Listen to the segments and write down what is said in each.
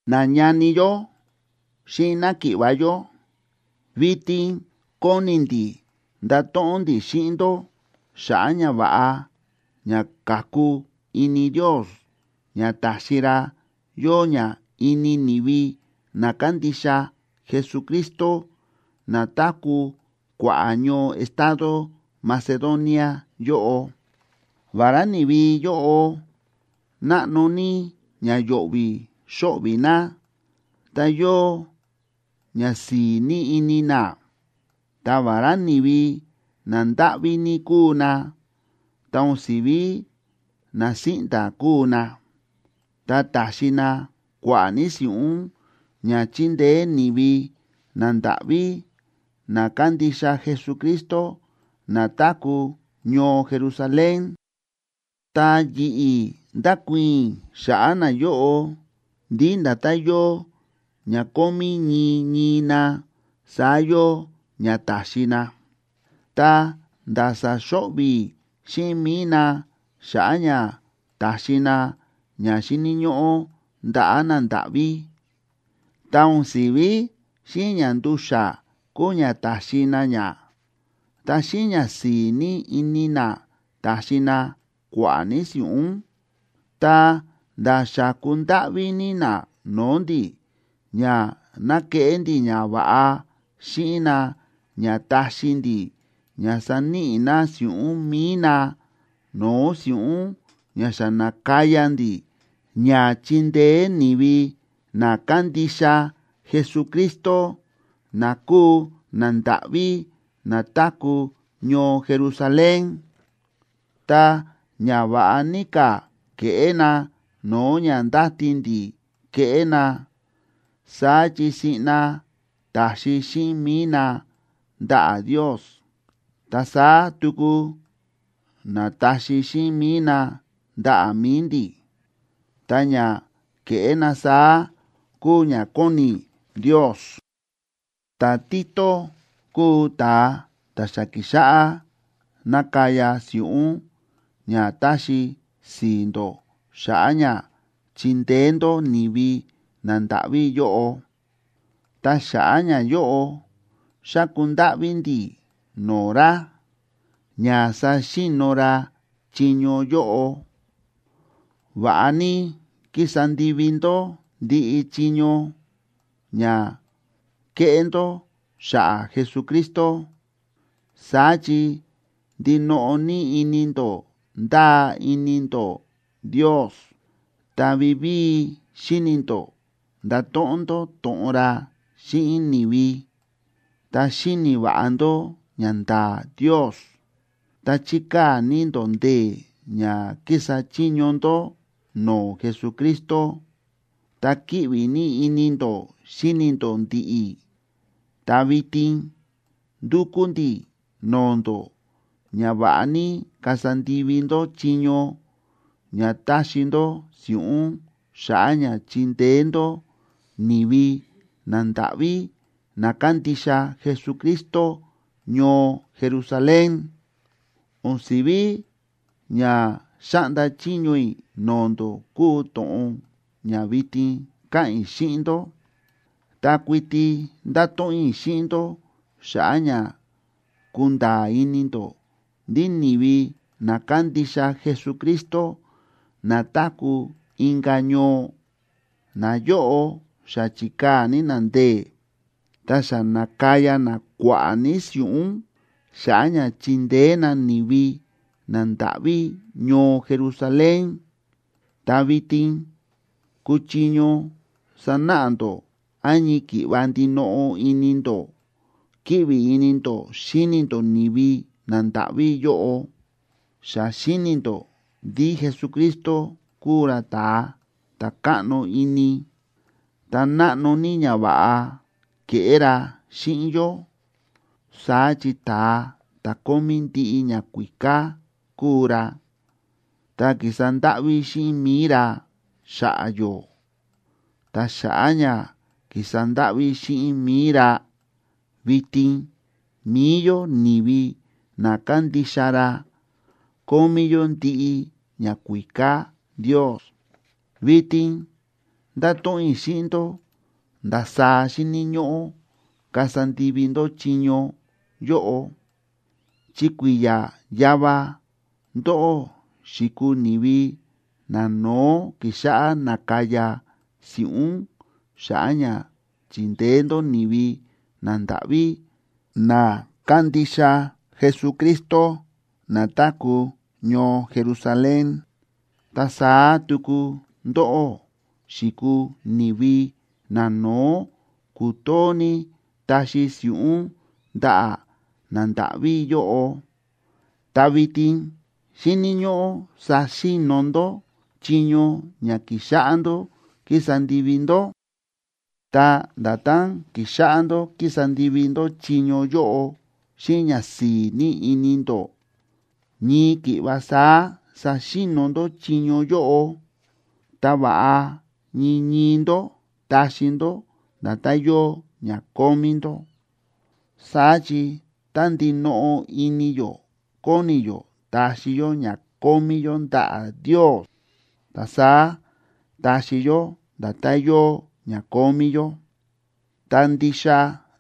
Nañani yó xíꞌin náki̱ꞌva̱ yó, vitin kóni ndi̱ ndato̱ꞌon ndi̱ xíꞌin ndó xa̱ꞌa̱ ñava̱ꞌa ña ka̱ku ini Ndios ña ta̱xi ra yóo ña ini ni̱vi na kándixa Jesucristo na táku̱ kua̱ꞌa̱ ñoo estado Macedonia yóꞌo. Vará ni̱vi yóꞌo náꞌno ní ña yo̱ꞌvi̱ xóꞌvi̱ na, ta yóo ñasi̱i̱ ní ini na. Ta vará ni̱vi nandáꞌví ní kúu na, ta o̱n si̱ví na síꞌnda̱ kúu na, ta ta̱xi na kua̱ꞌa̱ ní si̱ꞌún ña chindeé ni̱vi nandáꞌví na kándixa Jesucristo na táku̱ ñoo Jerusalén. Ta yi̱ꞌi̱ ndákuii̱n i̱ xa̱ꞌa̱ nayóꞌo ndí nda̱tán yóo ña kómí ñii ñii na, saá yóo ña ta̱xi na, ta̱nda̱ sa̱xo̱ꞌvi̱ xíꞌin mi̱i na xa̱ꞌa̱ ña ta̱xi na ña xíni̱ ñóꞌó ndaꞌa̱ nandáꞌví. Ta o̱n si̱ví xíꞌin ña ndu̱xa̱ kúu ña ta̱xi na ña, ta xíꞌin ñasi̱i̱ ní ini na ta̱xi na kua̱ꞌa̱ ní si̱ꞌún. Ta nda̱ xa̱ku ndáꞌví ní na no̱o̱ ndi̱ ña ná keꞌé ndi̱ ñava̱ꞌa xíꞌin na ña taxi ndi̱ ña saníꞌi na si̱ꞌún mi̱i na no̱o̱ si̱ꞌún ña xa na̱kaya ndi̱ ña chindeé ni̱vi na kándixa Jesucristo na kúu nandáꞌví na táku̱ ñoo Jerusalén. Ta ña va̱ꞌa ní ka̱ ke̱ꞌé na no̱o̱ ña ndáti ndi̱ keꞌé na. Saá chi siꞌna ta̱xi xíꞌin mi̱i na ndaꞌa̱ Ndios, ta saá tuku na̱taxi xíꞌin mi̱i na ndaꞌa̱ mi̱i ndi̱. Ta ña ke̱ꞌé na saá kúu ña kóni Ndios. Ta̱Tito kúu ta̱a ta̱ xa ki̱xáꞌá nakaya si̱ꞌún ña taxi si̱i̱ ndó xa̱ꞌa̱ ña chindeé ndó ni̱vi nandáꞌví yóꞌo. Ta xa̱ꞌa̱ ñayóꞌo, xa̱ku ndáꞌví ndi̱ no̱o̱ ra ña saxi̱no̱ ra chiño yóꞌo. Va̱ꞌa ní kísa ndivi ndó ndiꞌi chiño ña kéꞌé ndó xa̱ꞌa̱ Jesucristo. Saá chi ndinoꞌo ní ini ndó ndáa ini ndó Ndios, ta vivíi xíni̱ ndó ndato̱ꞌon ndó to̱ꞌon ra xíꞌin ni̱vi, ta xíni̱ va̱ꞌa ndó ñanda̱a̱ Ndios, ta chíkaa̱ ní ndó ndee̱ ña kísa chiño ndó no̱o̱ Jesucristo, ta kíꞌvi ní ini ndó xíni ndó ndi̱ꞌi̱. Ta vitin ndúkú ndi̱ no̱o̱ ndó ña va̱ꞌa ní kasa ndivi ndó chiño ña taxi ndó si̱ꞌún xa̱ꞌa̱ ña chindeé ndó ni̱vi nandáꞌví na kándixa Jesucristo ñoo Jerusalén. O̱n si̱ví ña xáꞌnda chiño i̱ no̱o̱ ndó kúu to̱ꞌon ña vitin káꞌa̱n i̱ xíꞌin ndó, ta kuiti ndáto̱ꞌon i̱ xíꞌin ndó xa̱ꞌa̱ ña kunda̱a̱ ini ndó ndí ni̱vi na kándixa Jesucristo na táku̱ inka̱ ñoo, nayóꞌo xa chi̱kaa̱ ní na ndee̱, ta xa na̱kaya na kua̱ꞌa̱ ní si̱ꞌún xa̱ꞌa̱ ña chindeé na ni̱vi nandáꞌví ñoo Jerusalén. Ta vitin kúchiño sanáꞌa ndó án ñii ki̱ꞌva ndinoꞌo ini ndó kíꞌvi ini ndó xíni ndó ni̱vi nandáꞌví yóꞌo. Xa xíni̱ ndó ndí Jesucristo kúu ra ta̱a ta̱ káꞌno ini, ta náꞌno ní ñava̱ꞌa ke̱ꞌé ra xíꞌin yó. Saá chi ta̱a ta̱ kómí ndiꞌi ñakuíká kúu ra, ta ki̱sa ndáꞌví xíꞌin mi̱i ra xa̱ꞌa̱ yó. Ta xa̱ꞌa̱ ña ki̱sa ndáꞌví xíꞌin mi̱i ra, vitin mi̱i yó ni̱vi na kándixa ra kómí yó ndiꞌi ñakuíká Ndios. Vitin ndáto̱ꞌon i̱ xíꞌin ndó ndasaá xíni̱ ñóꞌó kasa ndivi ndó chiño yóꞌo. Chi kui̱ya̱ yava ndóꞌó xi̱kuu ni̱vi nano̱ó ki̱xáꞌá nákaya si̱ꞌún xa̱ꞌa̱ ña chindeé ndó ni̱vi nandáꞌví na kándixa Jesucristo na táku̱ ñoo Jerusalén. Ta saá tuku ndóꞌó xi̱kuu ni̱vi nano̱ó ku̱too ní taxi si̱ꞌún ndaꞌa̱ nandáꞌví yóꞌo. Ta vitin xíni̱ ñóꞌó saxi̱no̱ ndó chiño ña ki̱xáꞌá ndó kísa ndivi ndó. Ta nda̱tán ki̱xáꞌá ndó kísa ndivi ndó chiño yóꞌo xíꞌin ñasi̱i̱ ní ini ndó, ñii ki̱ꞌva saá saxi̱no̱ ndó chiño yóꞌo. Ta va̱ꞌa ñii ñii ndó taxi ndó nda̱tán yóo ña kómí ndó. Saá chi tá ndinoꞌo ini yó kóni yó taxi yó ña kómí yó ndaꞌa̱ Ndios, ta saá táxi yó nda̱tán yóo ña kómí yó, ta ndixa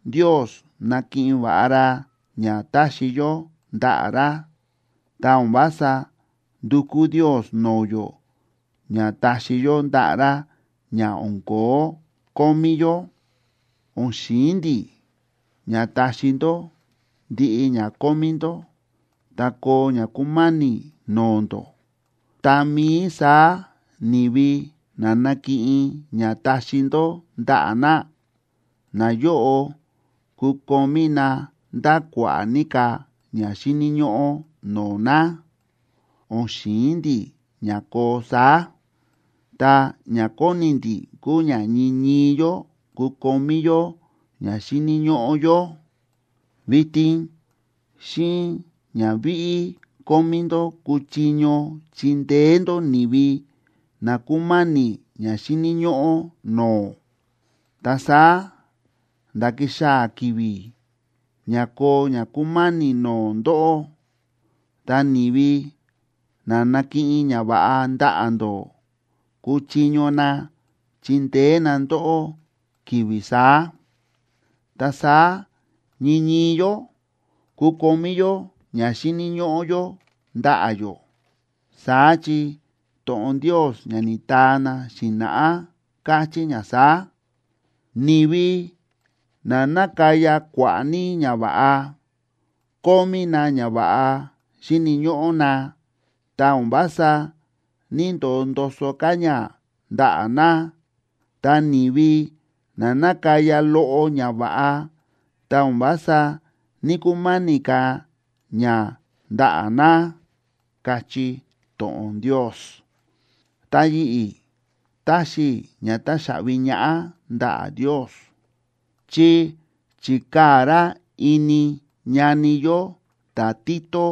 Ndios nákiꞌin va̱ꞌa ra ña táxi yó ndaꞌa̱ ra. Ta o̱n vása ndúkú Ndios no̱o̱ yó ña taxi yó ndaꞌa̱ ra ña o̱n ko̱ó kómí yó. O̱n xi̱in ndi̱ ña taxi ndó ndiꞌi ña kómí ndó, ta koo ña kúma̱ni̱ no̱o̱ ndó, tá mií saá ni̱vi na nakiꞌin ña taxi ndó ndaꞌa̱ na, nayóꞌo kukomí na nda̱ kua̱ꞌa̱ ní ka̱ ña xíni̱ ñóꞌó no̱o̱ na. O̱n xi̱in ndi̱ ña koo saá, ta ña kóni ndi̱ kúu ña ñii ñii yó kukomí yó ña xíni̱ ñóꞌó yó. Vitin xíꞌin ña víꞌí kómí ndó kúchiño chindeé ndó ni̱vi na kúma̱ni̱ ña xíni̱ ñóꞌó no̱o̱. Ta saá nda̱ kixaa̱ ki̱vi̱ ña koo ña kúma̱ni̱ no̱o̱ ndóꞌó, ta ni̱vi na na̱kiꞌin ñava̱ꞌa ndaꞌa̱ ndó, kuchiño na chindeé na ndóꞌó ki̱vi̱ saá. Ta saá ñii ñii yó kukomí yó ña xíni̱ ñóꞌó yó ndaꞌa̱ yó. Saá chi to̱ꞌon Ndios ña ni̱taa na xi̱na̱ꞌá káchí ña saá: “Ni̱vi na na̱kaya kua̱ꞌa̱ ní ñava̱ꞌa, kómí na ñava̱ꞌa xíni̱ ñóꞌó na, ta o̱n vása ní‑ndoo ndoso ka̱ ña ndaꞌa̱ na. Ta ni̱vi na na̱kaya loꞌo ñava̱ꞌa, ta o̱n vása ní‑kuma̱ni̱ ka̱ ña ndaꞌa̱ na”, káchí to̱ꞌon Ndios. Ta yi̱ꞌi̱ táxi i̱ ña táxaꞌvi ñaꞌá ndaꞌa̱ Ndios, chi chi̱kaa̱ ra ini ñani yó ta̱Tito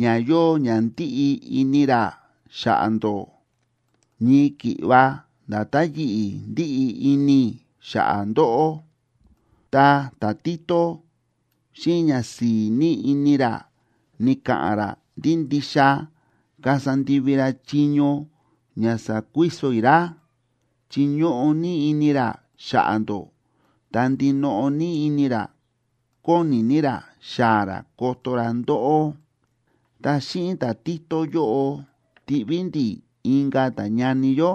ña yóo ña ndíꞌi ini ra xa̱ꞌa̱ ndó, ñii ki̱ꞌva nda̱tán yi̱ꞌi̱ ndíꞌi ini i̱ xa̱ꞌa̱ ndóꞌó. Ta ta̱Tito xíꞌin ñasi̱i̱ ní ini ra, ni̱ka̱ꞌa̱n ra ndí ndixa kasa ndivi ra chiño ña sa̱kuiso i̱ ra, chi ñóꞌo ní ini ra xa̱ꞌa̱ ndó, ta ndinoꞌo ní ini ra kóni ní ra xaa̱ ra koto ra ndóꞌó. Ta xíꞌin ta̱Tito yóꞌo, tiꞌví ndi̱ inka̱ ta̱ñani yó,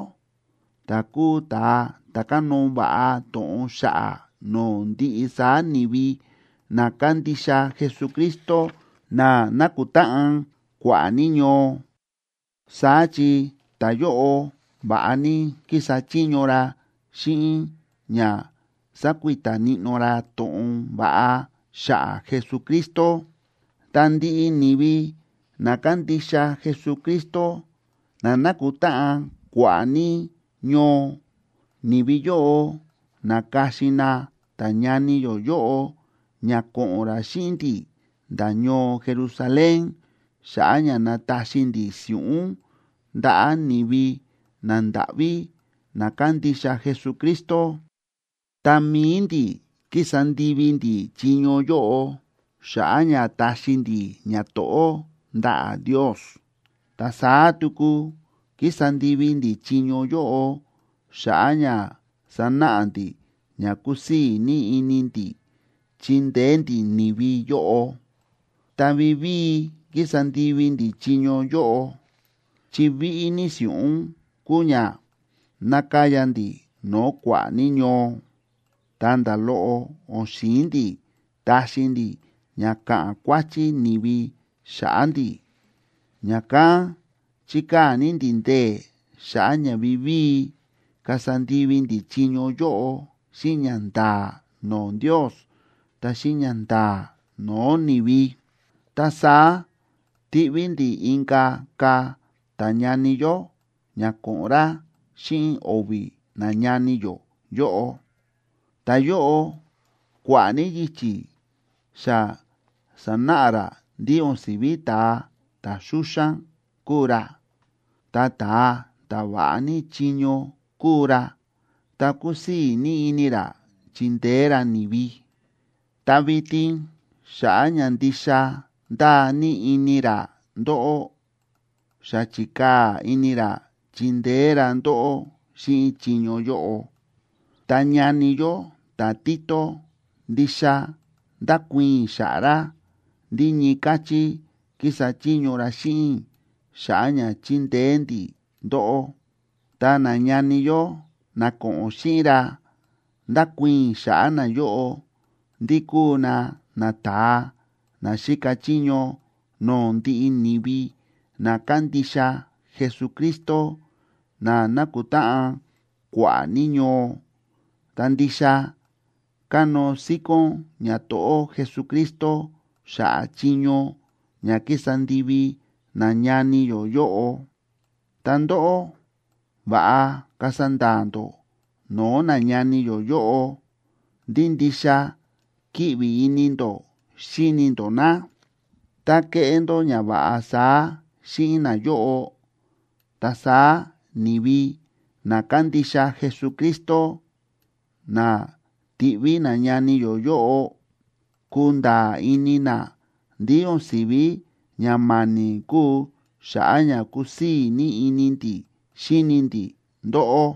ta̱ kúu ta̱a ta̱ kánóo va̱ꞌa to̱ꞌon xa̱ꞌa̱ no̱o̱ ndiꞌi saá ni̱vi na kándixa Jesucristo na nákutáꞌan kua̱ꞌa̱ ní ñoo. Saá chi ta̱yóꞌo va̱ꞌa ní kísa chiño ra xíꞌin ña sákuita níꞌnó ra to̱ꞌon va̱ꞌa xa̱ꞌa̱ Jesucristo. Ta ndiꞌi ni̱vi na kándixa Jesucristo na nákutáꞌan kua̱ꞌa̱ ní ñoo, ni̱vi yóꞌo na̱ka̱xin na ta̱ñani yó yóꞌo ña ko̱ꞌo̱n ra xíꞌin ndi̱ nda̱ ñoo Jerusalén xa̱ꞌa̱ ña nataxi ndi̱ si̱ꞌún ndaꞌa̱ ni̱vi nandáꞌví na kándixa Jesucristo. Ta mi̱i ndi̱ kísa ndivi ndi̱ chiño yóꞌo xa̱ꞌa̱ ña taxi ndi̱ ñato̱ꞌó ndaꞌa̱ Ndios, ta saá tuku kísa ndivi ndi̱ chiño yóꞌo xa̱ꞌa̱ ña sanáꞌa ndi̱ ña kúsii̱ ní ini ndi̱ chíndeé ndi̱ ni̱vi yóꞌo. Ta vivíi kísa ndivi ndi̱ chiño yóꞌo, chi víꞌí ní si̱ꞌún kúu ña nákaya ndi̱ no̱o̱ kua̱ꞌa̱ ní ñoo, ta nda̱ loꞌo o̱n xi̱in ndi̱ taxi ndi̱ ña ka̱ꞌa̱n kuáchí ni̱vi xa̱ꞌa̱ ndi̱. Ña̱kán chíkaa̱ ní ndi̱ ndee̱ xa̱ꞌa̱ ña vivíi kasa ndivi ndi̱ chiño yóꞌo xíꞌin ñanda̱a̱ no̱o̱ Ndios, ta xíꞌin ñanda̱a̱ no̱o̱ ni̱vi. Ta saá tiꞌví ndi̱ inka̱ ka̱ ta̱ñani yó ña ko̱ꞌo̱n ra xíꞌin o̱vi̱ nañani yó yóꞌo. Ta̱yóꞌo kua̱ꞌa̱ ní yichi̱ xa sa̱náꞌa ra ndí o̱n si̱ví ta̱a ta̱ xúxán kúu ra, ta ta̱a ta̱ va̱ꞌa ní chiño kúu ra, ta kúsii̱ ní ini ra chíndeé ra ni̱vi. Ta vitin xa̱ꞌa̱ ña ndixa ndáa ní ini ra ndóꞌó, xa chi̱kaa̱ ini ra chindeé ra ndóꞌó xíꞌin chiño yóꞌo. Ta ñani yó ta̱Tito, ndixa ndákuii̱n i̱ xa̱ꞌa̱ ra ndí ñii káchí kísa chiño ra xíꞌin i̱ xa̱ꞌa̱ ña chindeé ndi̱ ndóꞌó. Ta nañani yó na ko̱ꞌo̱n xíꞌin ra, ndákuii̱n i̱ xa̱ꞌa̱ nayóꞌo ndí kúu na nata̱a na xíka chiño no̱o̱ ndiꞌi ni̱vi na kándixa Jesucristo na nákutáꞌan kua̱ꞌa̱ ní ñoo, ta ndixa kánóo síkón ñato̱ꞌó Jesucristo xa̱ꞌa̱ chiño ña ki̱sa ndivi nañani yó yóꞌo. Ta ndóꞌó, va̱ꞌa kasa nda̱a̱ ndó no̱o̱ nañani yó yóꞌo ndí ndixa kíꞌvi ini ndó xíni ndó na. Tá keꞌé ndó ñava̱ꞌa saá xíꞌin nayóꞌo, ta saá ni̱vi na kándixa Jesucristo na ti̱ꞌví nañani yó yóꞌo, kunda̱a̱ ini na ndí o̱n si̱ví ña ma̱ni̱ kúu xa̱ꞌa̱ ña kúsii̱ ní ini ndi̱ xíni ndi̱ ndóꞌó.